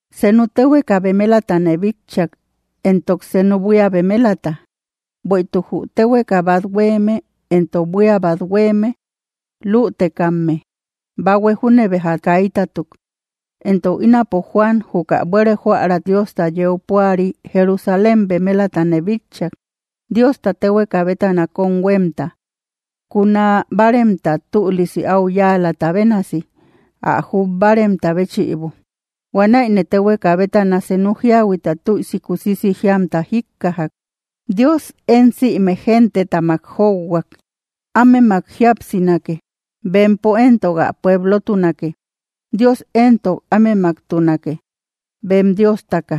Senu téhueka bemelatane bitchak, entok senu buía bemelata; bueïtuk jü téhueka bat huéeme entok buía bat huéeme lütekamme. Bahue júne béja kaitatuk. Entok ínapo Juan juka buére jóära Diosta yeu púari, Jerusalén bemelatane bitchak, Diosta téhueka bétana kóm huémta, kuna báaremta tülisi áu yáalata bénasi, ä jub báaremta béchïbo. Huanäine téhueka bétana senu jíahuita tüisi kusisi jíamta jíkkajak: —¡Dios én sïme gentetamak jóuhuak! Ámemak jíapsinake; bempo éntok ä pueblotunake. Dios éntok ámemaktunake, bem Diostaka.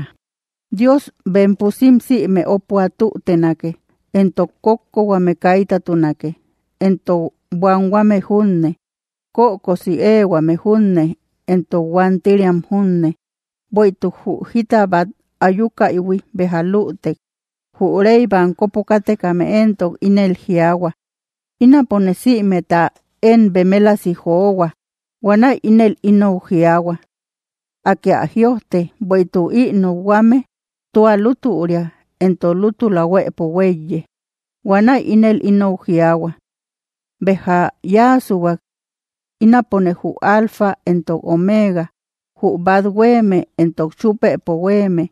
Dios bem pusim sïme ópua tútenake; entok kókkohuame kaitatunake, entok buanhuame junne. Kökosi éehuame junne, entok huántiriam junne, bueïtuk jü jita bát ayukaïhui béja lütek. Jü rey bankopo kátekame éntok ínel jiaahua: —Ínapone sïmeta én bemelasi johua. Huanäi ínel inou jiaahua: —Akë ä jïojte, bueïtuk ï nokhuame tua lútüria entok lútula huëpo huéiye. Huanäi ínel inou jiaahua: —Béja yáasuhuak. Ínapone jü Alfa entok Omega, jü bát huéeme entok chúpëpo huéeme.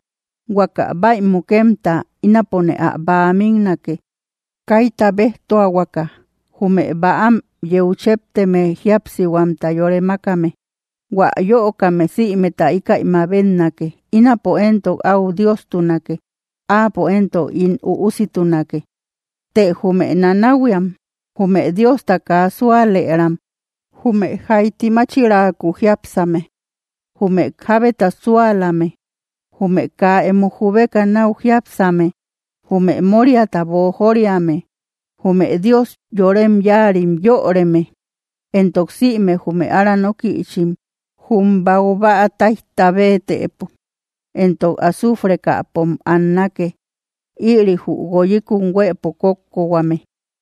Huaka bäimukemta, ínapone ä bäa miknake, kaita béjtuahuaka, jume bäam yeu chépteme jíapsihuamta yore mákame. Huä yöokame sïmeta íkäi mabetnake. Ínapo éntok áu Diostunake; áapo éntok ín üussitunake. Të jume nanahuiam, jume Diosta kaa súalëram, jume jaiti máchiraaku jiápsame, jume jábeta súalame, jume kaa emo jubeka náu jiápsame, jume móriata boojoriame, jume dios yorem yáarim yöreme, entok sïme jume ára nókïchim, jum baubäa táijta béetëpo entok azuufrekäpom annake. Ïri jü guoyikun huëpo kókkohuame.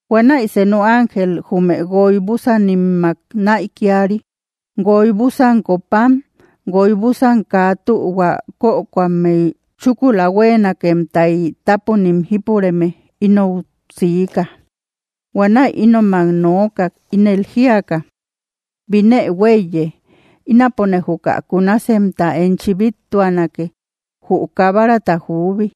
Huanäi senu ángel jume guoy búsanimmak näikiari, guoy búsan copam guoy búsan kaa tühua kökoammey chúkula hueenakemtay tápunim jípureme, inou siika. Huanäi ínomak nookak, ínel jíaka: —Binë huéiye. Ínapone juka kunasemta enchi bíttuanake, jü Kabarata juubi.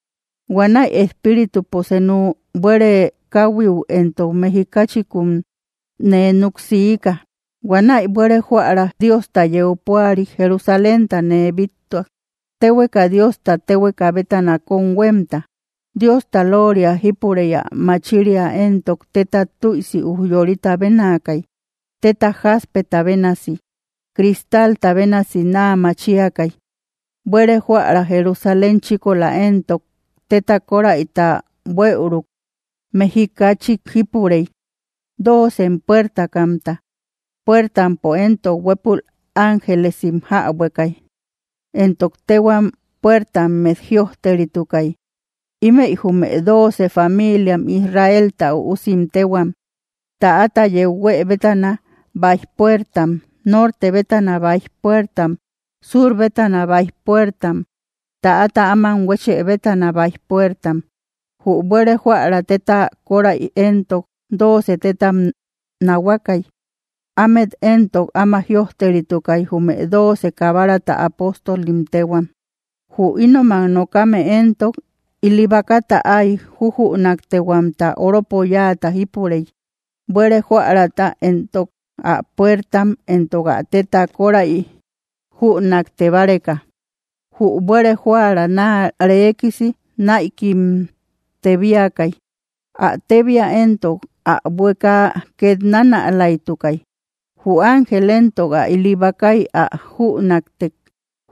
Huanäi Espíritupo senu buére káhuiu entok mejikachikun nee núk siika. Huanäi buére jóära Diosta yeu púari Jerusalénta nee bíttuak, téhueka Diosta tehueka bétana kóm huémta. Diosta lóoria jípurey; ä machiria éntok téta tüisi ujyorita bénaakay, téta jaspeta bénasi; cristalta bénasi naa machiakay. Buére jóära Jerusalén chíkola éntok téta kóräita buëuruk mejikachik jípurey, doocem puertakamta. Puertampo éntok huëpul ángelesim jäbuekay, entok téhuam puertammet jïojteritukay; ímëi jume dooce familiam Israelta üusim téhuam. Täata yeu huë bétana, báij puertam; norte bétana, báij puertam; sur bétana, báij puertam; täata áman huéchë bétana, báij puertam. Jü buére jóära téta kóräi éntok dooce tétam nahuakay. Ámet éntok áma jïojteritukay, jume dooce Kabarata apóstolim téhuam. Jü ínomak nokame éntok ili bakata áy jujünaktehuamta oropo yáata jípurey, buére jóärata entok ä puertam entok ä téta kóräi jünakte báreka. Jü buére jóära naa reekisi náikim tébiakay; ä tébia entok ä buékaa ket nánälaitukay. Jü ángel éntok ä ili bakay ä jünaktek,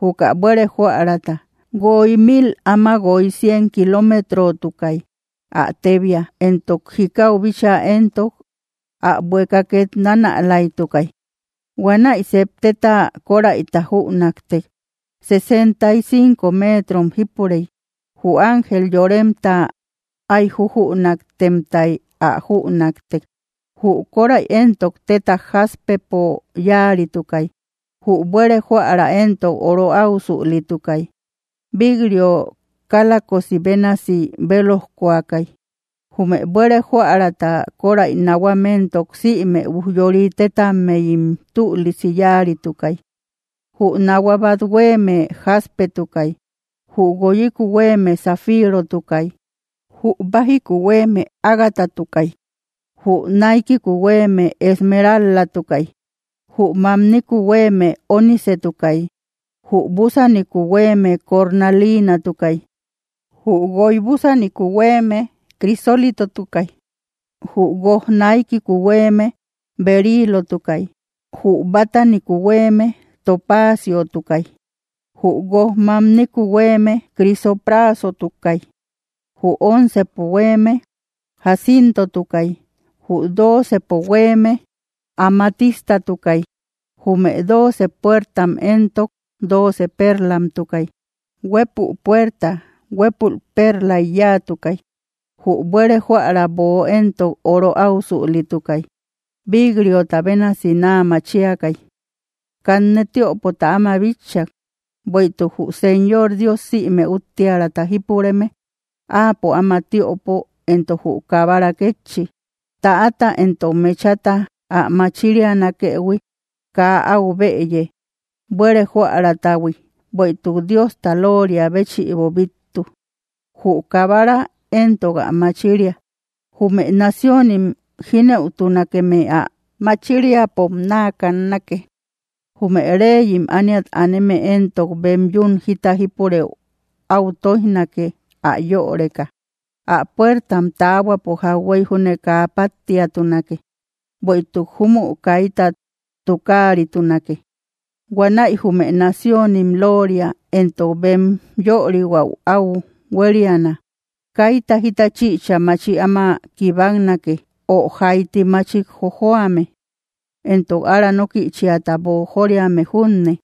juka buére jóärata: guoy mil áma guoy cien kilómetrotukay, ä tébia. Entok jikau bíchaa entok ä buekaa ket nánälaitukay. Huanäi sep téta kóräita jünäktek. Sesenta y cinco méetrom jípurey; jü ángel yoremta áy jujünaktemtay ä jünaktek. Jü kóräi éntok téta jaspepo yáaritukay; jü buére jóära éntok oro áusülitukay; vik‑rio kálakosi bénasi bélojkoakay. Jume buére jóärata kóräi nahuam éntok, sïme ujyori tétammeyim tülisi yáaritukay. Jü nahua bát huéeme jaspetukay; jü guoyiku huéeme zafirotukay; jü bájiku huéeme ágatatukay; jü naikiku huéeme esmerál-latukay; jü mamniku huéeme ónicetukay; jü búsaniku huéeme cornaliinatukay; jü guoy búsuniku huéeme crisólitotukay; jü guoj naikiku huéeme beriilotukay; jü bátaniku huéeme topaaciotukay; jü guoj mamniku huéeme crisopra satukay; jü oncepo huéeme jaciintotukay; jü doocepo huéeme amatistatukay. Jume dooce puertam éntok dooce pérlamtukay; huépü puerta huépül pérlay yáatukay. Jü buére jóära böo éntok oro áusülitukay; bik‑riota bénasi naa machiakay. Kanne tiöpota áma bitchak, bueïtuk jü Señor Dios sïme úttiäraata jípureme, áapo áma tiöpo, entok jü Kabara kétchi. Täata entok mechata ä machirianakëhui kaa áu bëye, buére jóäratahui, bueïtuk Diosta lóoria béchïbo bíttu. Jü Kabara éntok ä machiria. Jume naciónim jínëutunakeme ä machiriapom naa kannake. Jume reyim ániat aneme éntok bem yún jita jípurëu áu tóijnake, ä yöreka. Ä puertam taahuapo jauhuey júne kaa páttiatunake, bueïtuk júmü kaita tukaaritunake. Huanäi jume naciónim lóoria entok bem yörihuäu áu huériana. Kaita jita chïcha machi áma kibaknake, o jaiti machik jojoame, entok ára nókïchiata boojoriame junne;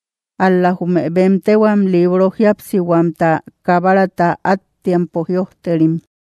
ál‑la jume bem téhuam libro jíapsihuamta Kabarata áttiampo jïojterim.